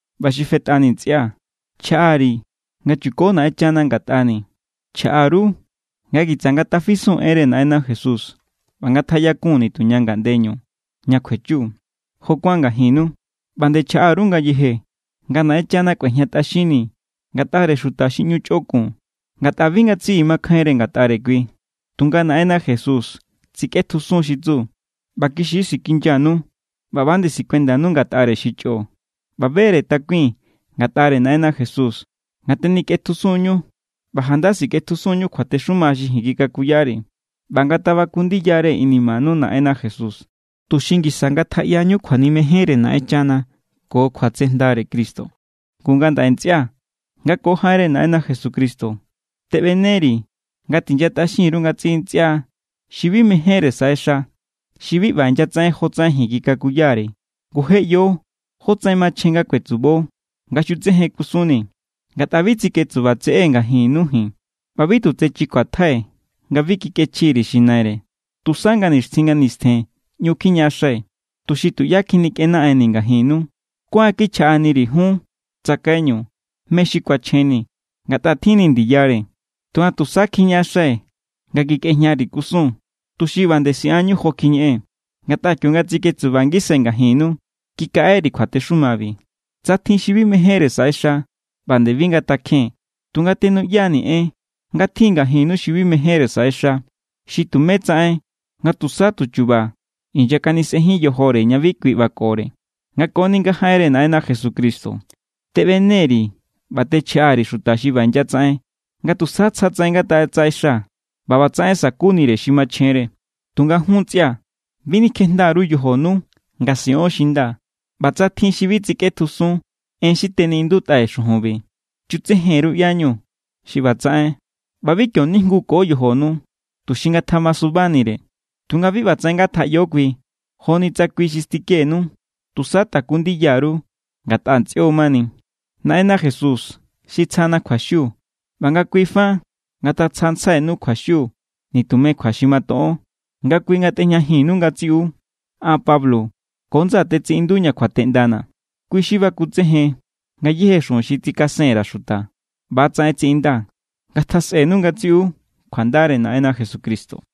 ꞌBa xi fetꞌani, ntsꞌia̱, chjaꞌari̱ nga chuko Naꞌenchana ngatꞌani̱. Chjaꞌa_ru nga kitsa ngatafisun enre Naꞌenna Jesús ꞌba ngatjaꞌyakun nituña ngaꞌndeñu ña kjuechu, jo kuán ngajinnu. ꞌBa nde chjaꞌa_ru ngayeje nga Naꞌenchana kꞌuejñatꞌaxinni̱ ngatꞌare xuta xi ꞌñu chꞌokun, ngatꞌa bi ngatsiꞌi makjainre ngatꞌare kui. Tunga Naꞌenna Jesús tsikꞌetjusun xi tsu, ꞌba kixi= sikinyanu ꞌba ꞌba=nde sikuendanu ngatꞌare xi chꞌo. ꞌBa be=re takui̱n ngatꞌare Naꞌenna Jesús nga tenikꞌetjusun=ñu ꞌba janda sikꞌetjusun=ñu kjuatexuma xi ji̱n kikakuyari̱. ꞌBa ngatabaku ndiyare inimanu Naꞌenna Jesús, tuxi ngisa ngatjaꞌyañu kjuanimejenre Naꞌenchana ko kjuatsejndare Cristo. Ngu ngandaꞌe, ntsꞌia̱, nga ko jaꞌenre Naꞌenna Jesucristo teꞌbeneri̱ nga tinyatꞌaxin_ru ngatsiꞌi ntsꞌia xi bi mejénre saꞌexa, xi bi ꞌba inyatsaꞌen jotsaꞌen ji̱n kikakuyari̱. Ngu je ꞌyo jótsaꞌen machjen nga kuetsubo nga xutsejen kusunnii̱, ngatꞌa bi tsiketsuba tseꞌée̱ ngajinnu ji̱n. ꞌBa bi tu tsechi kjuatjai̱ nga bi kikꞌechji_ri̱ xi naire. Tusa nga nixtjin nga nistjen ꞌñu kjiñaꞌaxai̱, tuxi tuꞌyá kjinikꞌenaꞌennii̱ ngajinnu. Kuáan kichjaꞌaniri̱ jun tsakaiñu mé= xi kuachjenni, ngatꞌa tjin=ni̱ ndiyare. Tunga tusa kjiñaꞌaxai̱ nga kikꞌejñari̱ kusun, tuxi ꞌba nde siꞌanñu jo kjiñeꞌee̱n. Ngatꞌa kionga tsiketsuba ngisai̱ ngajinnu, kikaꞌeri̱ kjuatexumabi: “Tsa tjin xi bi mejénre saꞌexa, ꞌba nde bi ngatakjen.” Tunga tenuꞌya=nii̱ en nga tjin ngajinnu xi bi mejénre saꞌexa, xi tumé tsaꞌen nga tusa tu chu̱ba̱ inyakanisꞌenjín yojore ña bi kui ꞌbakore. Nga koni nga jaꞌenre Naꞌenna Jesucristo teꞌbene_ri̱ ꞌba techjaꞌa_ri̱ xuta xi ꞌba inyatsaꞌen nga tusa tsja tsaꞌen ngatatsaꞌexa ꞌba ꞌbatsaꞌen sa̱kunire xi machjenre. Tunga jun ntsꞌia̱, bi nikjejnda_ru yojonu nga siꞌon xi nda. ꞌBa tsa tjin xi bi tsikꞌetjusun en xi teniꞌindutꞌai̱ xujunbi, chutsejen_ru ꞌyáñu xi ꞌba tsaꞌen ꞌba bi kio nijnguko yojonu, tuxi ngatjamasubanire. Tunga bi ꞌbatsaꞌen ngatjaꞌyo kui joni tsa kui xi stikenu. Tusa taku ndiya_ru, ngatꞌa ntsꞌio mani. Naꞌenna Jesús xi tsjana kjuaxiu ꞌba nga kui fa ngatatsjantsjainu kjuaxiu nitume kjua xi matoꞌon. Nga kui ngatꞌejñajinnu ngatsiꞌu. An Pablo ko ndsaa̱ tetsiꞌinduña kjuateꞌndana̱. Kui xi bakutsejen ngayéje xujun xi tsikasen_ra̱ xuta. ꞌBa=tsaꞌen tsiꞌindaa̱. Ngatjasꞌenu ngatsiꞌu kjuandare Naꞌenna Jesucristo.